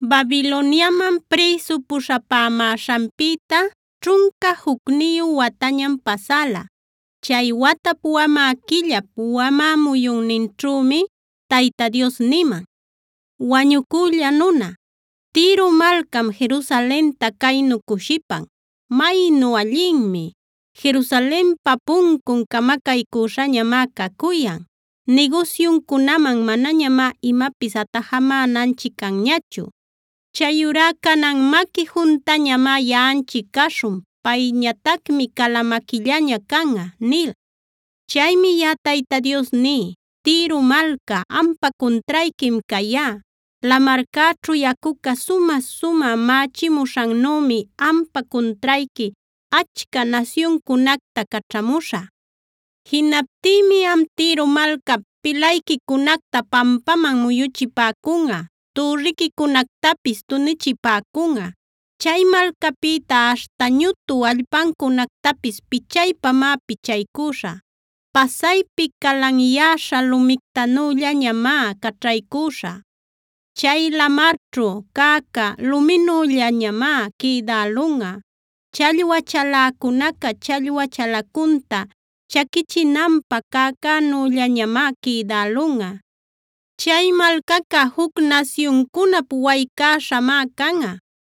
Babiloniaman prïsu puśhapämäśhanpïta ćhunca jucniyu watañam pasäla. Chay watap wamä quillap, wamä muyunninćhümi Tayta Dios niman: “Wañucülla nuna, Tiro malcam Jerusalenta caynu cushipan: ‘¡Maynu allinmi! Jerusalenpa puncun camacaycüśhañamá cacuyan; nigusyuncunaman manañamá imapis atajamänanchic canñachu. Chayurá canan maqui juntañamá yaꞌanchic caśhun; payñatacmi cala maquillaña canꞌa’ nil. “Chaymi yaꞌa Tayta Dios ní: Tiro malca, ampa cuntrayquim cayá. Lamarcäćhu yacuca sumä-sumä mächimuśhannümi ampa cuntrayqui achca nasyuncunacta caćhamuśhä. “Jinaptïmi am Tiro malcap pilayquicunacta pampaman muyuchipäcunꞌa; türriquicunactapis tunichipäcunꞌa. Chay malcapïta aśhta ñutu allpancunactapis pichaypamá pichaycüśhä. Pasaypi calanyäśha lumictanüllañamá caćhaycüśhä. Chay lamarćhua cäca luminüllañamá quïdälunꞌa, challwa chaläcunaca challwa chalacunta chaquichinanpä cäcänüllañamá quïdälunꞌa. Chay malcaca juc nasyuncunap waycäśhamá canꞌa.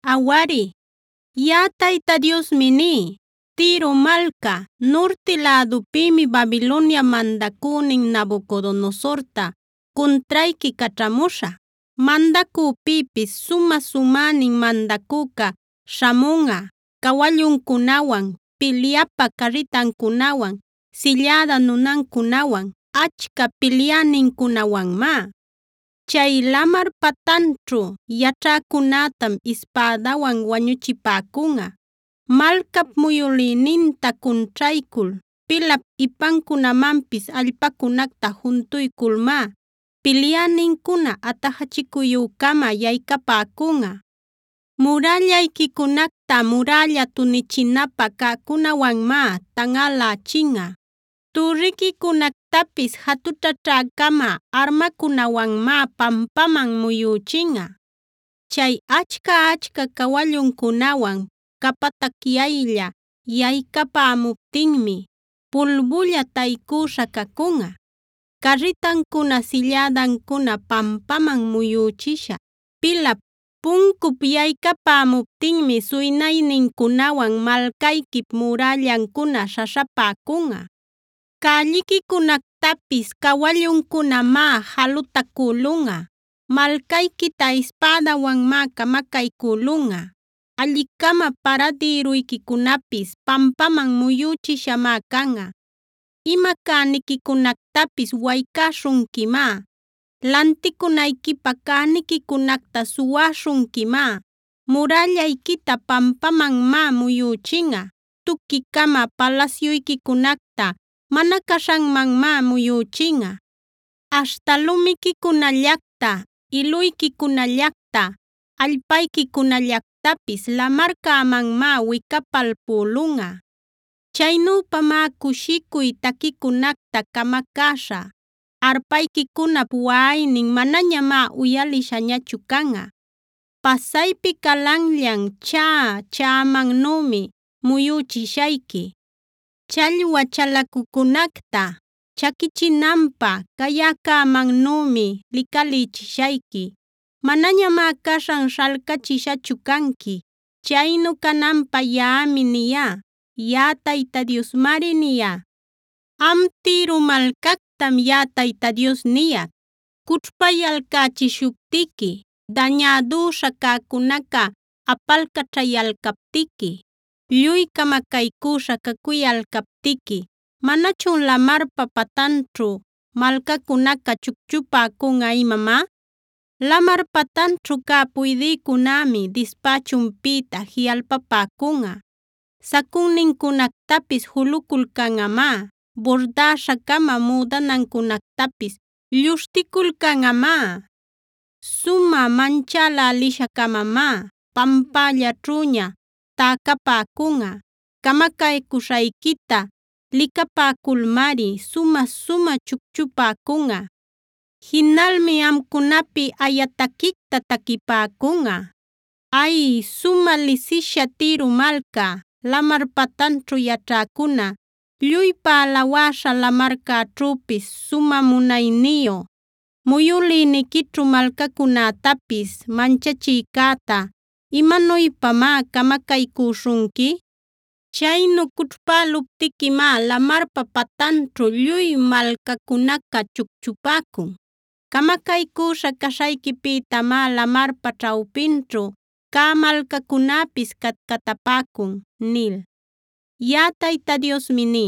“Awari, yaꞌa Tayta Diosmi ní: Tiro malca, nurti lädupïmi Babiloniap mandacünin Nabucodonosorta cuntrayqui caćhamuśhä. Mandacüpïpis sumä-sumänin mandacüca śhamunꞌa cawalluncunawan, pilyapä carritancunawan, silläda nunancunawan, achca pilyänincunawanmá. Chay lamar patanćhu yaćhäcunätam ispädawan wañuchipäcunꞌa. Malcap muyülïninta cunćhaycul, pilap ipancunamanpis allpacunacta juntuyculmá pilyänincuna atajachicuyü-cama yaycapäcunꞌa. Murällayquicunacta murälla tunichinapä cäcunawanmá tanꞌalächinꞌa. Türriquicunactapis jatućhäćhä-cama armacunawanmá pampaman muyüchinꞌa. Chay achca-achca cawalluncunawan capatacyaylla yaycapämuptinmi pulbulla taycüśha cacunꞌa. Carritancuna, sillädancuna pampaman muyüchisha pilap, puncup yaycapämuptinmi suynaynincunawan malcayquip mürallancuna śhaśhapäcunꞌa. Cälliquicunactapis cawalluncunamá jalutacülunꞌa. Malcayquita ispädawanmá camacaycülunꞌa. Alli-cama paradïruyquicunapis pampaman muyüchishamá canꞌa. Ima cäniquicunactapis waycäśhunquimá, lanticunayquipä cäniquicunacta suwäśhunquimá, murällayquita pampamanmá muyuchinꞌa, tuqui-cama palasyuyquicunacta mana caśhanmanmá muyüchinꞌa, aśhta lumiquicunallacta, iluyquicunallacta, allpayquicunallactapis lamarcämanmá wicapalpülunꞌa. Chaynüpamá cushicuy taquiquicunacta camacäśhä; arpayquicunap waꞌaynin manañamá uyalishañachu canꞌa. Pasaypi calanllan chaꞌa chaꞌamannümi muyüchishayqui. Challwa chalacucunacta chaquichinapä cayäcämannümi licalïchishayqui. Manañamá caśhan śhalcachishachu canqui. Chaynu cananpä yaꞌami niyá; yaꞌa Tayta Diosmari niyá. “Am Tiro malcactam yaꞌa Tayta Dios niyac: Cućhpayalcächishuptiqui, dañädüśha cäcunaca apalcaćhayalcaptiqui, lluy camacaycüśha cacuyalcaptiqui, ¿manachun lamarpa patanćhu malcacunaca chucchupäcunꞌa imamá? Lamar patanćhu cä puydïcunämi dispächunpïta jiꞌalpapäcunꞌa; sacunnincunactapis juluculcanꞌamá, burdäśha-cama müdanancunactapis luśhticulcanꞌamá. Sumä manchälälisha-camamá pampällaćhüña täcapäcunꞌa; camacaycuśhayquita licapäculmari sumä-sumä chucchupäcunꞌa. Jinalmi amcunapi aya taquicta taquipäcunꞌa: “ ‘Ay, sumä lisisha Tiro malca, lamar patanćhu yaćhäcuna, lluypa alawäśha, lamarcäćhüpis sumä munayniyu, muyülïniquićhu malcacunätapis manchachïcäta, ¿imanuypamá camacaycüśhunqui? Chaynu cućhpäluptiquimá lamarpa patanćhu lluy malcacunaca chucchupäcun. Camacaycüśha caśhayquipïtamá lamarpa ćhawpinćhu cä malcacunäpis catcatapäcun’ nil. “Yaꞌa Tayta Diosmi ní: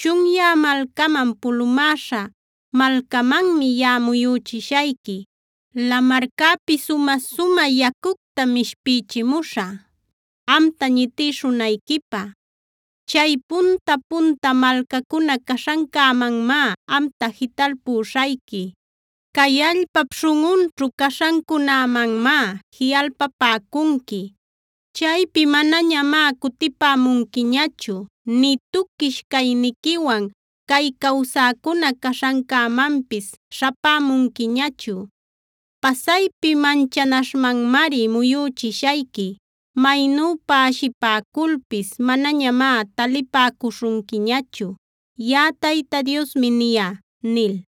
Chunyä malcaman, pulumäśha malcamanmi yaꞌa muyüchishayqui. Lamarcäpi sumä-sumä yacuctam ishpichimuśhä amta ñitïshunayquipä. Chay punta-punta malcacuna caśhancämanmá amta jitalpüśhayqui. Cay allpap śhunꞌunćhu caśhancunämanmá jiꞌalpapäcunqui. Chaypi manañamá cutipämunquiñachu; nï tuquish cayniquiwan cay cawsäcuna caśhancämanpis śhapämunquiñachu. Pasaypi manchanaśhmanmari muyüchishayqui. Maynüpa ashipäculpis manañamá talipäcuśhunquiñachu. Yaꞌa Tayta Diosmi niyá” nil.